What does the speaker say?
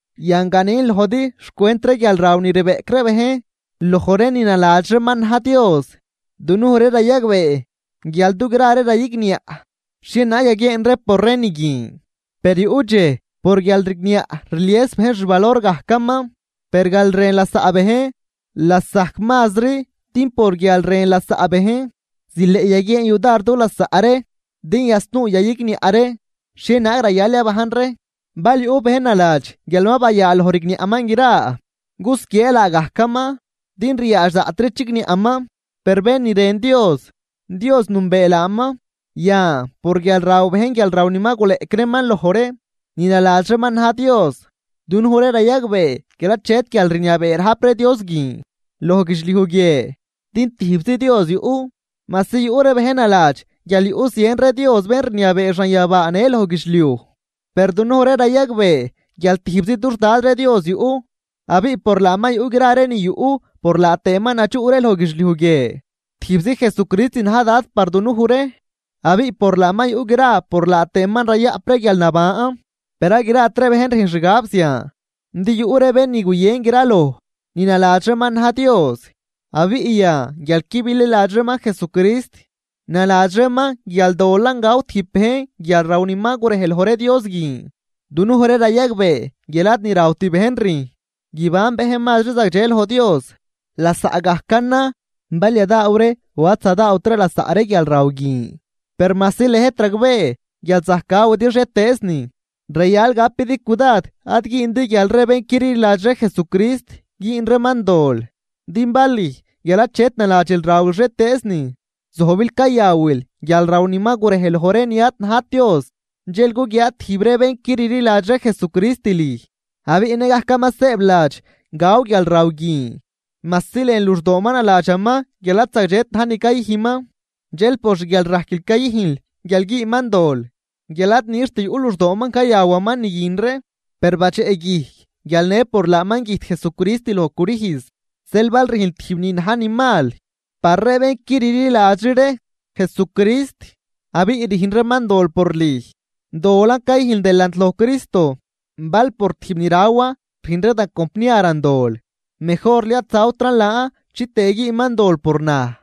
Yan, ganin lojdi xcwent ree guialraw ni rbeꞌc ree bejn loj ree ni naladx reeman na̱j Dios. Dunuj ree rayagbee guial dugra ree rayigniaꞌ xhienaag yaguieen ree por ree ni guin, per yuꞌ dxej por guialrigniaꞌ rlies bejn xvalor gajcaman. Per guialrën lasaꞌ bejn lasajc mazri din por guial rën lasaꞌ bejn zileꞌ yaguieen yudar du lasaꞌ ree din yasnuu yayigniaꞌ ree xhienaag rayal yabajn ree. Bal yuꞌ bén naladx guial ma bayaaloj rigniaꞌman gra, cusquiee laagajcaman din ryaadx daꞌtri chigniaꞌman. Per bén ni rën Dios, Dios nünbee laaman. Yan por guial raw bejn guialraw ni ma guleꞌc reeman loj ree ni naladx reeman na̱j Dios, dunuj ree rayagbee guial achet guialrniabee rajp ree dios guin loj guidxliuj guie, din tijbzi Dios yuꞌ. Majsi yuꞌ ree bejn naladx guial yuꞌ zien ree dios bén rniabee xanyabaa në loj guidxliuj, per dunuj ree rayagbee guial tijbzi dux Dad ree Dios yuꞌ abiꞌ por laaman yuꞌ gra ni yuꞌ por laa tëëman nadxuꞌ ree loj guidxliuj guie. Tijbzi Jesucrist na̱j Dad par dunuj ree abiꞌ por laaman yuꞌ gra por laaman tëë rayaꞌp ree guialnaban. Per ad grat ree bejn rüjn xgab zian. Din yuꞌ ree bén ni guyën graloj ni naladx reeman na̱j Dios, abiꞌ yan guial qui bililadxri reeman Jesucrist naladx reeman guial dolan gaw tijb bejn guialraw ni ma gurej loj ree dios guin. Dunuj ree rayagbee guial ad ni rawt bejn rüjn guiban bejn mazri zagdxe loj Dios, lasaꞌgajcanan bal yadaaw ree o ad zadaawt ree lasaꞌ ree guialraw guin. Per majsi lëjt ragbee guial zajc gawidi xhietëëznin, rayal gapidi cudad ad güündi guial ree bén qui rliladxri Jesucrist güün reeman dol. Din bal lüj guial achet naladxil rawil xhietëëznin, zojbil cayawil guialraw ni ma gurej loj ree ni ad najt dios. Dxel guguiaa tijb ree bén qui rliladxri Jesucrist lüj abiꞌ nëgajcaman sëëbladx gaw guialraw guin majsi lën luxdooman naladxaman guial ad zagdxet na̱j ni cayüjnman. Dxel por xguialrajquil cayüjnl guial güünman dol guial ad nixt yuꞌ luxdooman cayawaman ni guin ree, per badxeꞌguijc guial në por laaman güjt Jesucrist loj crüjz. Zeel bal rüjnl tijb ni na̱j ni mal par ree bén qui rliladxri ree Jesucrist abiꞌ rüjn reeman dol por lüj, dolan cayüjnl delant loj Cristo. Bal por tijb ni rawan rüjn ree da compniaran dol, mejorli ad zawtran laan chitëë güünman dol por naj.